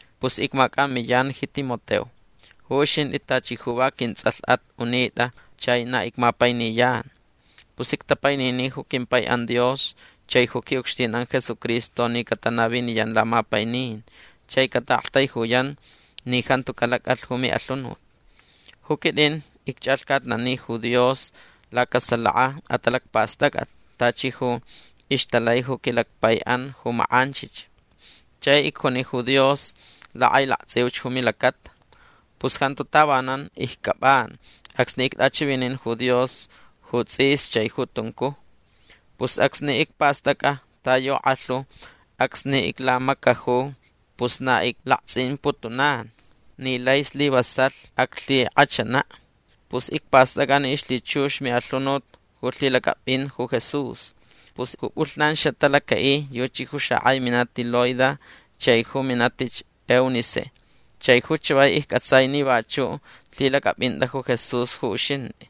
Pus icmacʼamiyan ji Timoteo. Ju uxintʼi tachi ju va quintsʼalhʼat unitʼa chai na icmapainiyan. Pus ictapainini ju quimpaiʼan Dios chai ju quiʼucxtinʼan Jesucristo ni catanaviniyan lamapainin chai cataʼaktaijuyan ni jantu calacʼalh ju miʼalhunut. Ju quitʼin icchʼalhcatnani ju Dios lacasalaka atalacpastʼacʼat tachi ju ixtalai ju quilacpaiʼan ju makʼanchich. Chai icjuni ju Dios lakʼailaktsʼiuch ju milacata. Pus jantu tavanan iccʼapʼan acsni ictʼachivinin ju Dios ju tsʼis chai ju tuncuj. Pus acsni icpastʼacʼa ta yu kʼalhu acsni iclamacaju pus na iclaktsʼimputunan ni lai slivasalh aclhikʼachanaʼ. Pus icpastʼacʼa ni ixlhichux miʼalhunut ju lhilacʼapʼin ju Jesús. Pus ju pʼulhnan xatalacaʼi yuchi ju xakʼai minati Loida chai ju minatich Eunice. Chai ju chavai iccʼatsai ni vachuʼ lhilacʼapʼintʼa ju Jesús ju uxintʼi.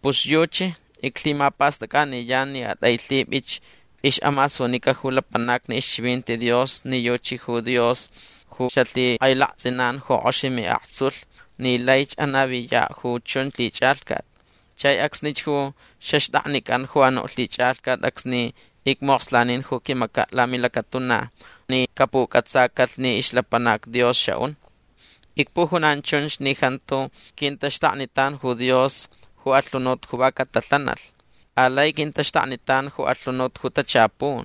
Pus yuchi iclhimapastʼacʼaniyan ni atʼailhipʼich ixʼamasunica ju lapanacni ixchivinti Dios ni yuchi ju Dios ju xalhikʼailaktsʼinan ju kʼox miʼaktsulh ni laich anaviyaʼ ju chun lhichʼalhcat. Chai acsnich ju xaxtʼaknicʼan ju anuʼ lhichʼalhcat acsni icmokslanin ju quimacaʼ lamilacatuna ni capucʼatsacalh ni ixlapanac Dios xaʼun. Icpujunan chunch ni jantu quintaxtaknitan ju Dios ju alhunut ju va catalhanalh. Alai quintaxtaknitan ju alhunut ju tachapun.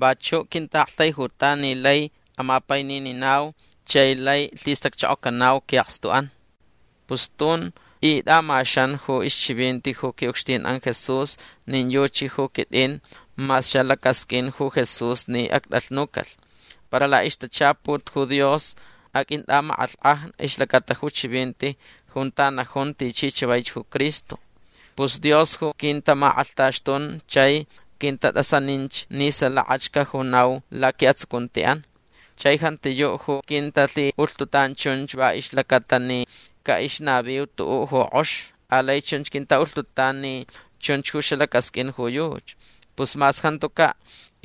Vachuʼ quintaʼaktaijutan ni lai amapainininau chai lai lhistacchokocanau quiʼakstuʼan. Pus tun tʼitʼamaxan ju ixchivinti ju quiʼucxtinʼan Jesús nin yuchi ju quitʼin mas xalacasqʼuin ju Jesús ni actʼalhnucalh. Para laʼixtachaput ju Dios aqʼuintʼamakʼalhkʼaj ixlacata ju chivinti junta najun tichi chavaich ju Cristo. Pus Dios ju quintamakʼalhtaxtun chai quintatʼasaninch ni salakach cajunau laquiʼatsucuntiʼan. Chai jantiyuʼ ju quintalhiʼulhtutan chunch va ixlacata ni caʼixnaviu tuʼuʼ ju kʼox. Alai chunch quintaʼulhtutan ni chunch ju xalacasqʼuin ju yuchi. Pus mas jantucaʼ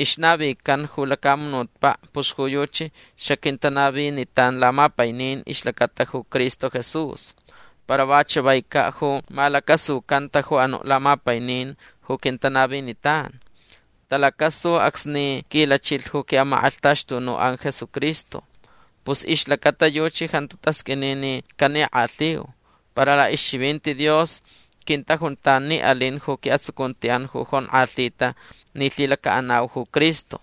ixnavican ju lacamunutpaʼ pus ju yuchi xaquintanavinitan lamapainin ixlacata ju Cristo Jesús. Para va chavaicaʼ ju malacasucanta ju anuʼ lamapainin ju quintanavinitan. Talacasu acsni quilachilh ju quiʼamakʼalhtaxtunuʼan Jesucristo. Pus ixlacata yuchi jantu tasqʼuini ni canikʼalhiu. Para laʼixchivinti Dios quintajuntan ni alin ju quiʼatsucuntiʼan ju jonkʼalhita ni lhilacaʼanau ju Cristo.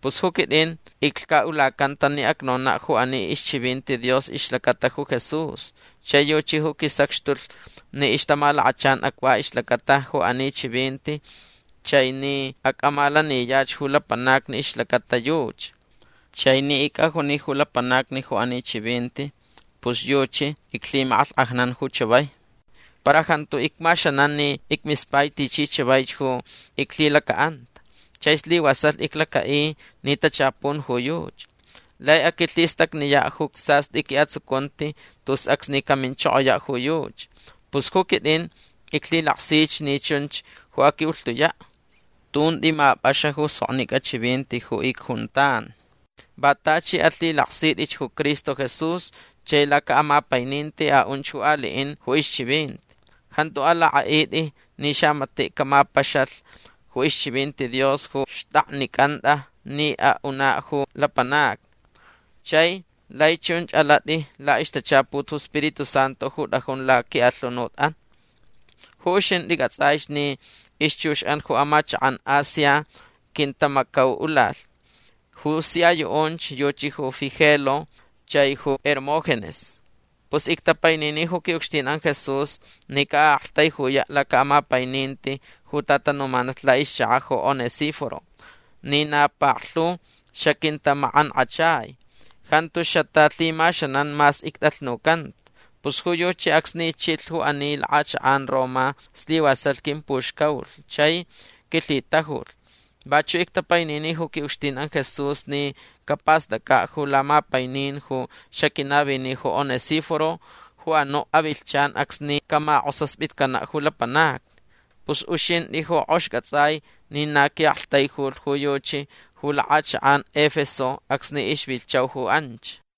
Pus ju quitʼin iclhcaʼulacanta ni acnonaʼ ju ani ixchivinti Dios ixlacata ju Jesús. Chai yuchi ju quisacxtulh ni ixtamalakachan acva ixlacata ju ani chivinti chai ni acʼamalaniyach ju lapanacni ixlacata yuchi. Chai ni icʼajuni ju lapanacni ju ani chivinti pus yuchi iclhimakʼalhkʼajnan ju chavai. Para jantu icmaxanan ni icmispai tichi chavaich ju iclhilacaʼanta. Chai slivasalh iclacaʼi ni tachapun ju yuchi. Lai aquilhistacniyaʼ ju sastʼi quiʼatsucunti tus acsni caminchokoyaʼ ju yuchi. Pus ju quitʼin iclhilaksich ni chunch ju aquiʼulhtuyaʼ. Tun tʼimapʼaxa ju soknicʼa chivinti ju icjuntan. Va tachi alhilaksitʼich ju Cristo Jesús chai lacaʼamapaininti aʼunch ju aliʼin ju ixchivinti. Jantu alakʼaʼitʼi ni xamatiʼ camapaxalh ju ixchivinti Dios ju xtʼaknicʼantʼa ni aʼunaʼ ju lapanacni. Chai lai chunch alatʼi laʼixtachaput ju Spiritu Santu ju tʼajun laquiʼalhunutʼan. Ju uxintʼi cʼatsʼaich ni ixchuxʼan ju amachakʼan Asia quintamacauʼulalh. Ju sia yuʼunch yuchi ju Figelo chai ju Hermógenes. Pus ictapainini ju quiʼucxtinʼan Jesús ni caʼaʼaktaijuyaʼ lacaʼamapaininti ju tatanumanalh laʼixchakaʼ ju Onesíforo ni na paklhu xaquintamakʼankʼachai. Jantu xatalhimaxanan mas ictʼalhnucanta. Pus ju yuchi acsni chilh ju ani lakʼachakʼan Roma slivasalh quimpuxcaulh chai quilhitajulh. Vachuʼ ictapainini ju quiʼucxtinʼan Jesús ni capastʼacʼaʼ ju lamapainin ju xaquinavini ju Onesíforo ju anuʼ avilhchan acsni camakʼosaspitcanaʼ ju lapanacni. Pus uxintʼi ju kʼox cʼatsʼai ni na quiʼaktaijulh ju yuchi ju lakʼachakʼan Efeso acsni ixvilhchau ju anch.